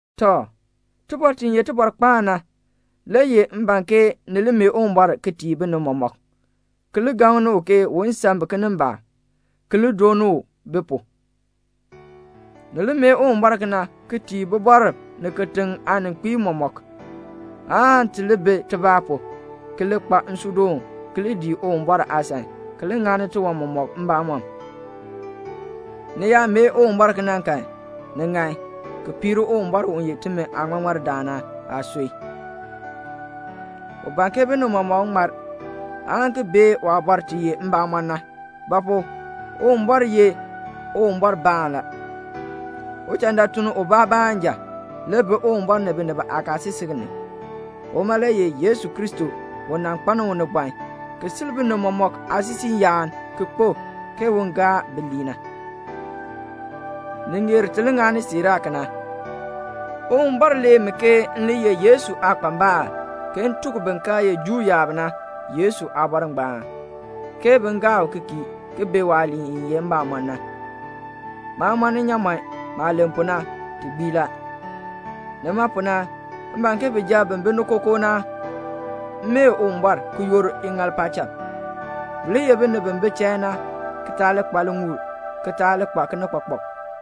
Tɔ, tibɔr ti ye tibɔrkpaan na le ye m ban ke ni li mee Uwumbɔr ki tii binib mɔmɔk, ki li gaŋni u ke un san bi kinimbaak, ki li dooni u bi pu. Ni li mee Uwumbɔr kena ki tii bibɔrb ni kitiŋ aaninkpiib mɔmɔk, aan ti li bi tibaa pu, ki li kpa nsuudoon, ki li dii Uwumbɔr aasan, ki li ŋani tiwan mɔmɔk mbamɔm. Ni yaa mee Uwumbɔr kena kan, ni ŋan, ki piir Uwumbɔr u ye timi aaŋmaŋmardaan na aasui. U ban ke binib mɔmɔk ŋmar, aan ki bee waabɔr ti ye mbamɔn na. Ba pu? Uwumbɔr ye Uwumbɔrbaan la. Uchandaatuln ubaa baanja le bi Uwumbɔr ni binib aakaasisik ni. Uma le ye Yesu Kristo u nan kpaln unibɔn ki sil binib mɔmɔk aasisiiyaan ki kpo, ke un gaa bi lii. Ni ŋeer ti li ŋani siiraa kena. Uwumbɔr lee mi ke m le ye Yesu aakpambal, ke m tuk bin kaa ye Juu yaab na Yesu aabɔr ngbaan, ke bin gaa u ki kii, ki bee waaliin i ye mbamɔn na. Maa mɔn nnyaamɔn, maah len pu na, ti gbii la. Nima pu na, m ban ke bijab bi bi ni kookoo na mee Uwumbɔr, ki yoor iŋaal paacham. Bi li ye binib bi bi chain na, ki taa li kpa liŋuul, ki taa li kpa kinikpakpak.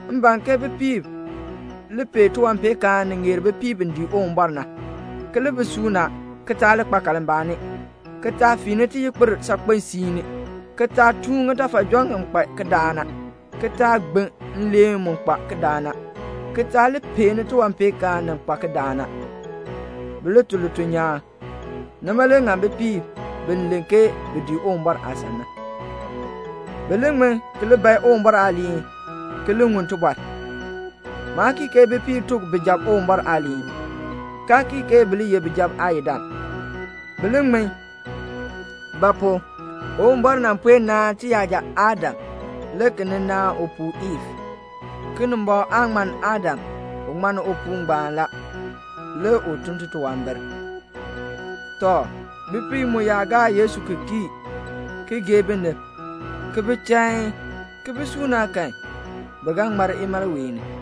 M ban ke bipiib li pee tiwanpeenkaan ni ŋeer bipiib bi dii Uwumbɔr na, ki li bi suuna, ki taa li kpa kalmbaani, ki taa fiini tiyikpir saakpen siini, ki taa tuun ŋitafajɔn ŋi kpa kidaak na, ki taa gbin nleen mu kpa kidaak na, ki taa li peeni tiwanpeenkaan ni kpa kidaak na. Bi li tun lituln nyaan. Nima le ŋann bipiib bi len ke bi dii Uwumbɔr aasan na. Bi li ŋmin ki li bae Uwumbɔr aaliin ki li ŋun tibɔr. Maa kii ke bipiib tuk bijab Uwumbɔr aaliin, kaa kii ke bi li ye bijab aayidam. Bi li ŋmin. Ba pu? Uwumbɔr nan puen naan tiyaja Adam, le ki nin naan upuu Iif. Kinimbɔŋ aa ŋmann Adam, u ŋmann upii ngbaan la, le u tun titunwambir. Tɔ, bipiib mu yaa gaa Yesu ki kii, ki gee binib, ki bi chain, ki bi suuna kan, bi ga ŋmar imalween ni.